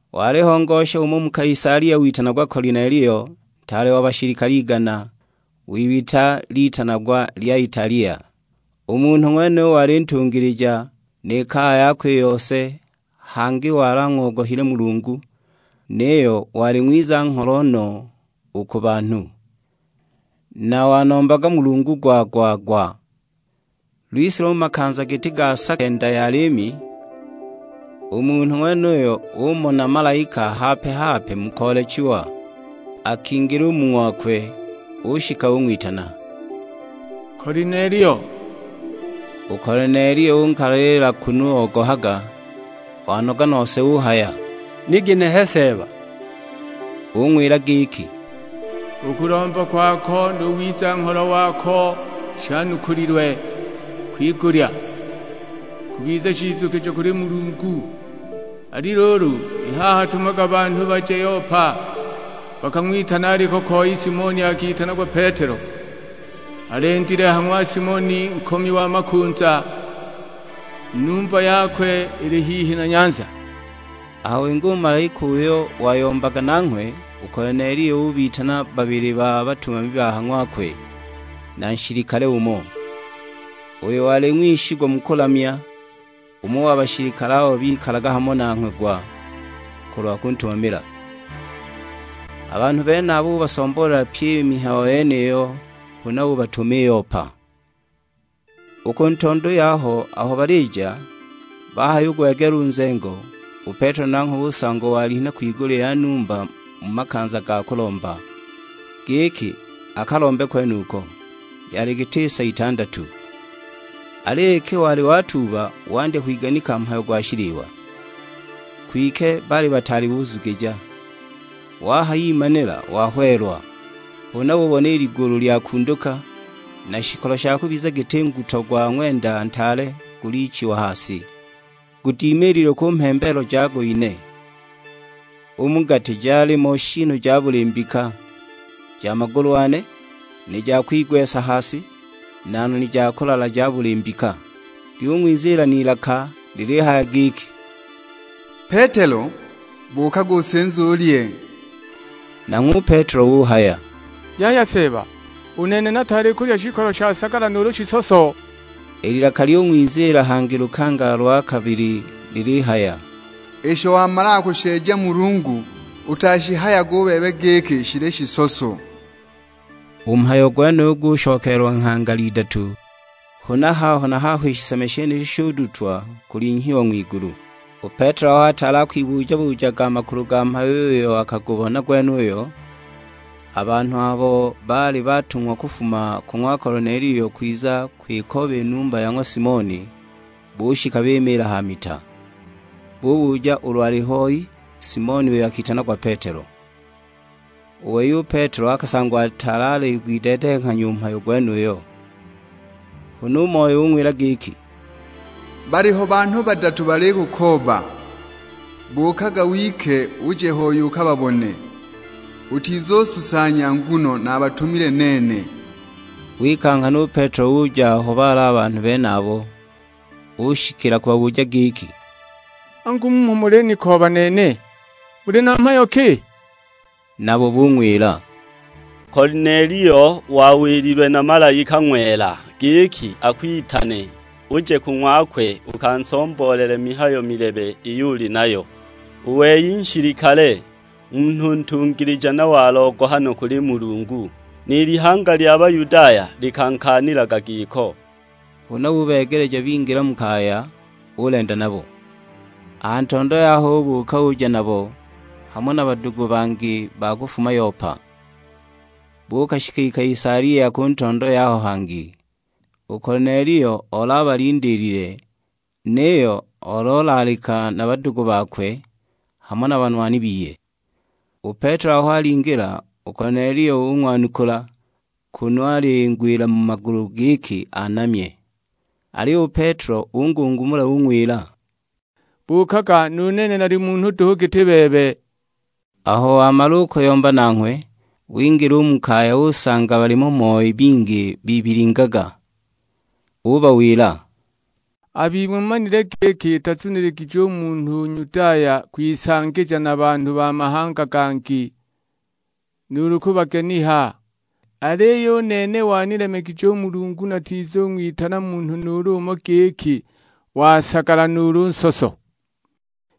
Waliho ngosha umo mu Kaisalia witanagwa Kolinelio, ntaale wa bashilikale igana; w'ibita litanagwa lya Italia. U munhu ng'wenuyo wali ntungilija, ni kaya yakwe i yose, hangi wali ang'ogohile Mulungu; niyo wali ng'wiza-ngholo no u ku banhu, na wanombaga Mulungu gwa-gwa-gwa. Lwise lumo makanza giti ga sa kenda ya liimi, u munhu ng'wenuyo umona malaika hape-hape mu koolechiwa. Akingila u mu ng'wakwe; ushika ung'witana, "Kolinelio." U Kolinelio unkalalila kunu ogohaga; wanoga nose uhaya, "Ni ginehe Seeba!" Ung'wila giki, "U kulomba kwako nu wiza-ngholo wako shanukulilwe nuulu: shalinhile.' kwigulya, kubiza shizukijo kuli Mulungu. Ali luulu, i haha tumaga banhu baje Yopa, bakang'witane aliko koi Simoni akitanagwa Petelo. Alendile ha ng'wa Simoni nkomi wa makunza, numba yakwe ili hihi na nyanza!" Aho winga u malaika uyo wayombaga nanghwe, u Kolinelio ubitana babili ba batumami ba ha ng'wakwe, na nshilikale umo, uyo wali ng'wishigwa mu kulamya, umo wa bashilikale abo bikalaga hamo nanghwe gwa, kulwa kuntumamila. A banhu benabo ubasomboolela pyi i mihayo yeniyo, huna ubatuma i Yopa. U ku ntondo yaho aho balija, bahayugwegeela u nzengo, u Petelo nanghwe usangwa walinha kwigulya ya numba mu makanza ga kulomba, giki akalombe kwenuko; yali giti sa itandatu. Aliyo iki wali watuuba, wandya kwiganika mhayo gwa shiliwa, kwike baali bataali buzugija; wahayimanila wahweelwa. Huna ubona i ligulu lyakunduka, na shikolo sha kubiza giti nguto gwa ng'wenda ntaale gulichiwa ha si, gudimililwe ku mhembeelo jago ine. U mu gati jalimo shiinu ja buli mbika: ja magulu ane, ni ja kwigwesa ha si, na noni ja kulala ja buli mbika. Lyung'wiziila n'ilaka lilihaya giki, "Petelo, buukaga usinze ulye." Nanghwe u Petelo uhaya, "Yaya Seeba; u nene nataali kulya shikolo sha sagala nuulu shisoso." I lilaka lyung'wiziila hangi lukangala lwa kabili lilihaya, "Isho wamalaga kusheeja Mulungu, utashihayage u bebe giki shili shisoso." U mhayo gwenuyo gushokeelwa nghangala idatu, huna haho na haho i shiseme shenisho shudutwa kulinhyiwa ng'wigulu. U Petelo aho ataali akwibuja-bujaga a makulu ga mhayo uyo akagubona gwenuyo, a banhu abo baali batung'wa kufuma ku ng'wa Kolinelio kwiza kwikooba i numba ya ng'wa Simoni, bushika bimiila ha mita. Bubuja ulu aliho hoi Simoni uyo akitanagwa Petelo. U wei u Petelo akasangwa ataali aligwideedenghanya u mhayo gwenuyo, huna u Moyo ung'wila giki, "Baliho banhu badatu balikukooba. Buukaga wike uje hoi ukababone, utizususanya nguno nabatumile nene." Wika nghana u Petelo uja aho baali a banhu benabo; ushikila kubabuja giki, "Angu mmho mulinikooba nene, muli na mhayo ki?" Nabo bung'wila, "Kolinelio wawililwe na malaika ng'wela, giki akwitane uje ku ng'wakwe ukansomboolele mihayo milebe iyo uli nayo. U wei nshilikale, munhu ntungilija na wa logohano kuli Mulungu; ni lihanga lya Bayudaya likankaanilaga giko." Huna ubeegeleja bingila mu kaya, ulenda nabo. A ha ntondo yaho ubuuka uja nabo, hamo na badugu bangi ba kufuma Yopa. Buukashika i Kaisalia ku ntondo yaho hangi. U Kolinelio oli abalindiilile, niyo oli olaalika na badugu bakwe, hamo na banwani biye. U Petelo aho alingila, u Kolinelio ung'wanukula, kunu alingwila mu magulu giki anamye. Aliyo u Petelo ungungumula ung'wila, "Buukaga; nu nene nali munhu duhu giti bebe." Aho wamala u kuyomba nanghwe, wingila u mu kaya usanga balimo moi bingi bibilingaga. Ubawila, "A bing'we mumanile giki itazuniligije u munhu u Nyudaya kwisangija na banhu ba mahanga gangi, nuulu kubageniha; aliyo u nene wanilemegije u Mulungu natizung'witana munhu nuulu umo giki wa sagala nuulu nsoso.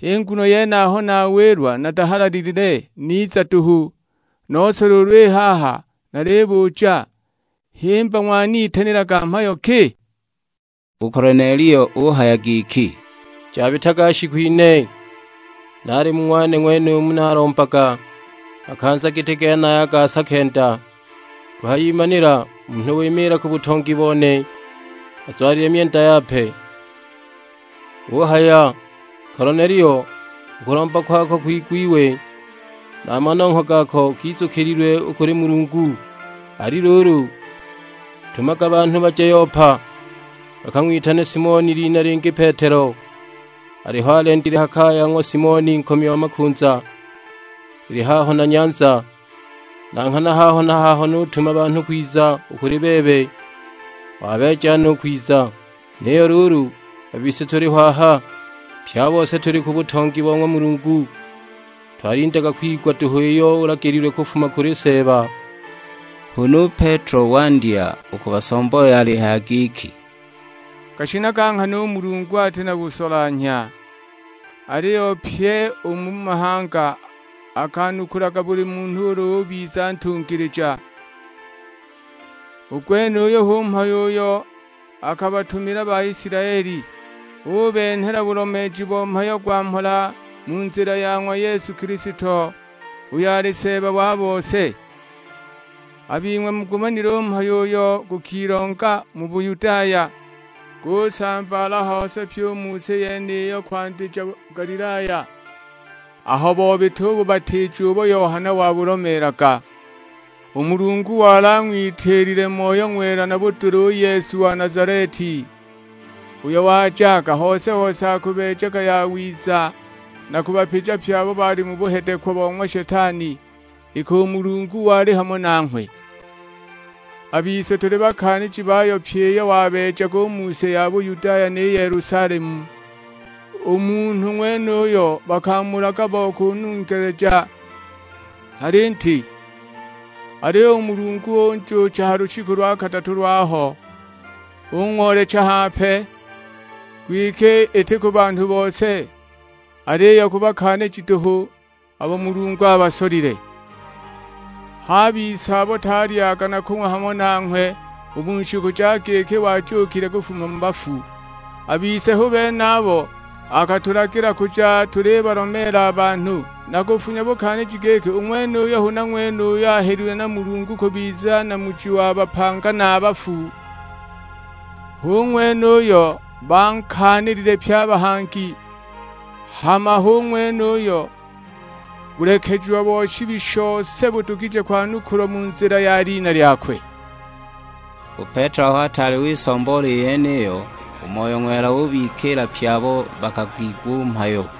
H'i nguno yene aho nawilwa natahalalilile, niza duhu; nose luulu i haha nalibuja, himba ng'wanitanilaga mhayo ki?" U Kolinelio uhaya giki, "Jabitaga shiku ine, naali mu ng'wane ng'wenumu nalombaga makanza giti genaya ga sa kenda, kuhayimanila munhu wimiila ku butongi bone, azwalile myenda yape. Uhaya, 'Kolinelio, u kulomba kwako kwigwiwe, na a manongho gako gizukililwe u kuli Mulungu. Ali luulu, tumaga banhu baje Yopa, bakang'witane Simoni, lina lingi Petelo; aliho alendile ha kaya ya ng'wa Simoni nkomi wa makunza, ili haho na nyanza.' Na nghana haho na haho nutuma banhu kwiza u kuli bebe, wabeeja no u kwiza. Niyo luulu, a bise tuliho aha, pye a bose tuli ku butongi bo ng'wa Mulungu, twalindaga kwigwa duhu iyo ulagililwe kufuma kuli Seeba." Huna u Petelo wandya u kubasomboolela alihaya giki, "Gashinaga nghana u Mulungu ati na busolanhya, aliyo pyi u mu mahanga akanukulaga buli munhu ulu ubiza ntungilija. U gwenuyu hu mhayo uyo akabatumila Baisilaeli, ubenhela bulomeeji bo mhayo gwa mhola mu nzila ya ng'wa Yesu Kilisto, uyo ali Seeba wa bose. A bing'we mugumanile u mhayo uyo gukilonga mu Buyudaya, gusambaala hose pye u mu si yeniyo kwandija Galilaya, aho bobita u bubatiija ubo Yohana wabulomeelaga. U Mulungu wali ang'witiilile Moyo Ng'wela na budula u Yesu wa Nazaleti, uyo wajaga hose-hose akubeejaga yawiza na kubapija pye abo bali mu buhedekwa bo ng'wa Shetani, iki u Mulungu wali hamo nanghwe. A bise tuli bakaaniji bayo pyi iyo wabeejaga u mu si ya Bayudaya ni Yelusalemu; u munhu ng'wenuyo bakamulaga bo kunungeleja ha linti. Aliyo u Mulungu unjuucha ha lushiku lwa kadatu lwaho, ung'oolecha hape; kwike iti ku banhu bose, aliyo ku bakaaniji duhu, abo Mulungu abasolile. H'a bise abo twalyaga na kung'wa hamo nanghwe u mu shiku ja giki wajuukile kufuma mu bafu. A bise hu bene abo akatulagila kuja tulibalomeela a banhu, na kufunya bukaaniji giki u ng'wenuyu huna ng'wene uyo ahelilwe na Mulungu kubiza Namuji wa bapanga na a bafu. Hu ng'wene uyo bankaanilile pye a bahangi, hama hu ng'wene uyo bulekejiwa bo shibi shose budugije kwanukulwa mu nzila ya lina lyakwe." U Petelo aho ataali wisomboola i yeniyo, u Moyo Ng'wela ubikiila pye abo bakagwigwa u mhayo.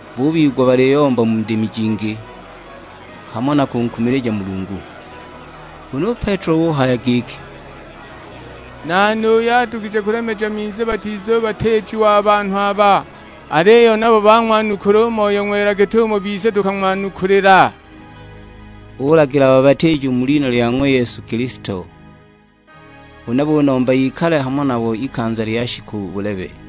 Bubigwa baliyomba mu ndimi jingi, hamo na kunkumilija Mulungu. Huna u Petelo uhaya giki, "Nani uyo adugije kulemeja minzi batizubatiijiwa a banhu aba, aliyo nabo bang'wanukula u Moyo Ng'wela git'umo bise tukang'wanukulila?" Ulagila babatiijiwe mu lina lya ng'wa Yesu Kilisto. Huna bunomba ikale hamo nabo ikanza lya shiku bulebe.